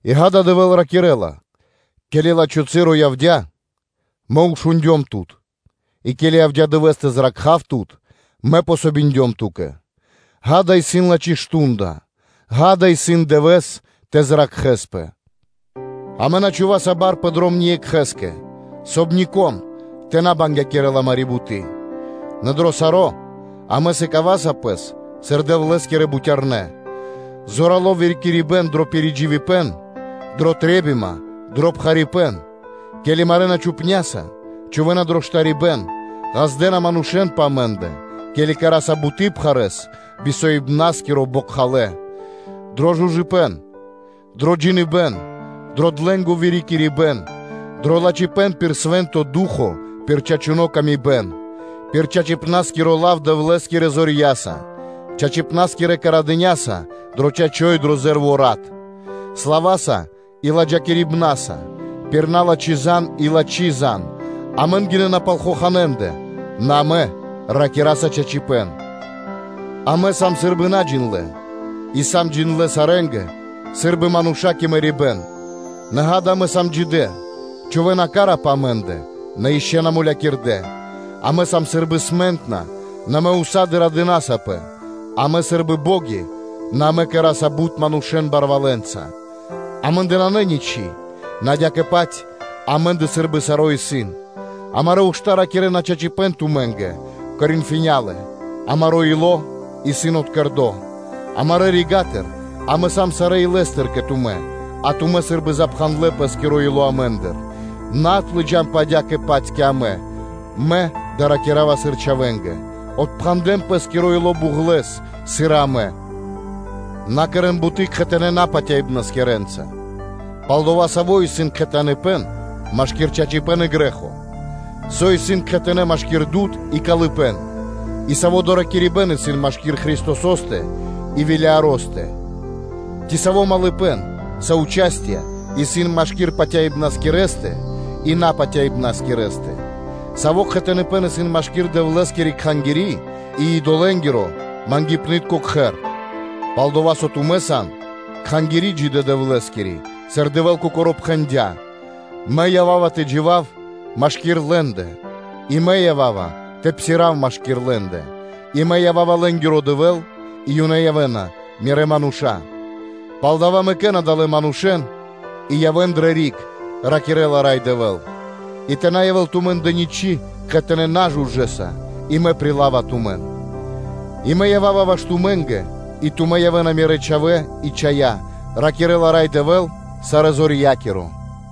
и, ґа́да, Дэвэ́л ракирэ́ла: “Ке́ли лачхо́ часо явдя́, мэ шундём тумэн: и ке́ли явдя́ дывэ́с тэ зракхав тумэн, Мэ дыём васт (помогиндём) ту́кэ.” Ѓа́да, исын лачхо́ мардо́ (шту́нда); ґа́да, исын дывэ́с тэ зракхэспэ: амэ на чхуваса бар пэ дром ниекхэ́скэ, соб (кай) нико́н тэ на бангякирэл амари́ буты́; нэ дро саро́ амэ сыкаваса пэс сыр Дэвлэ́скирэ бутярнэ́: зорало́ вырикирибэн дро пиридживибэн, дрэ трэ́бима, дро пхарипэ́н; ке́ли марэна амэн чупняса, чхувэ́на дро штарибэ́н, ґаздэ́на манушэ́н пэ амэ́ндэ, ке́ли кэра́са буты́ пхарэ́с, би соибнаскиро, бокхалэ́; дро жужыпэн, дро джиныбэ́н, дро длэнго вырикирибэн, дро лачхипэ́н пир Свэ́нто Ду́хо (Фа́но), пир чачуны́ пшалы́тко паты́в; пир чачипна́скиро лав, Дэвлэ́скирэ зорья́са, чачипна́скирэ мардытконэ́са дро чачо́ и дро зэ́рво (ле́во) васт; слава́са и ладжакирибнаса, пир на́лачхо лав и шарибэ́н; амэн гинэ́на пал хоханэ́ манушэ́ндэ, нэ амэ ракираса чачипэ́н; амэ сам сы́рбы наджиндлэ и сам джиндлэ́ сарэ́нгэ, сы́рбы мануша́ кэ мэрибэ́н, нэ ґа́да, амэ сам джидэ́; чхувэ́на хась (ка́ра) пэ амэ́ндэ, на ишчо (инкэ́) на мулякирдэ́; амэ сам сы́рбы смэнтна (скучна), нэ амэ ўса́ды (сак) радынасапэ; амэ сам сы́рбы бо́ги, нэ амэ кэра́са бут манушэ́н барвалэнца; амэ́ндэ нанэ ничы́, нэ адя́кэ-паць амэ́ндэ сы́рбы саро́ исын. Амарэ́ ушта́ ракирэ́на чачипэ́н тумэ́нгэ. Коринфиня́лэ, амаро́ ило́ исын откэрдо. Амарэ́ рига́тыр амэ сам сарэ́ илэ́стыр кэ тумэ́, а тумэ́ сы́рбы запхандлэ пэ́скиро ило́ амэ́ндыр, нэ отлыджанпэ адя́кэ-паць кэ амэ (мэ да́ва ракира́ва сыр чхавэ́нгэ): отпхандэн пэ́скиро ило́ буґлэс, сыр и амэ. На кэрэ́н буты́ кхэтанэ́ напатяибнаскирэнца; пал-дова́ со саво́ исын кхэтаныпэн машки́р чачипэ́н и грэ́хо? Со исын кхэтанэ́ машки́р дуд (свэ́то) и калыпэ́н? И саво́ доракирибэ́н исын машки́р Христосо́стэ и Велиаро́стэ? Ци саво́ кхэтаныпэн исын машки́р патяибнаскирэстэ и напатяибнаскирэстэ? Саво́ кхэтаныпэн исын машки́р Дэвлэ́скири кхангири́ и идолэ́нгирэ – мангипны́тко кхэр? Пал-дова́ со тумэ́ сан кхангири́ джидэ́ Дэвлэ́скири, сыр Дэвэ́л Кокоро́ пхэндя́: “Мэ ява́ва тэ джива́в машки́р лэ́ндэ и Мэ ява́ва тэ псирав машки́р лэ́ндэ. И Мэ ява́ва лэ́нгиро Дэвэ́л, и ёнэ явэ́на Мирэ́ мануша́.” “Палдава́ мэкэ́н адалэ́ манушэ́н и явэ́н дрэ риг, – ракирэ́ла Рай Дэвэ́л, – и тэ на явэ́л тумэ́ндэ ничы́ кхэтанэ́ нажужэса, и Мэ прилава тумэн; и Мэ ява́ва ваш тумэ́нгэ и тумэ́ явэ́на мирэ́ чхавэ́ и чхая́, – ракирэ́ла Рай Дэвэ́л Сарэзорья́киро.”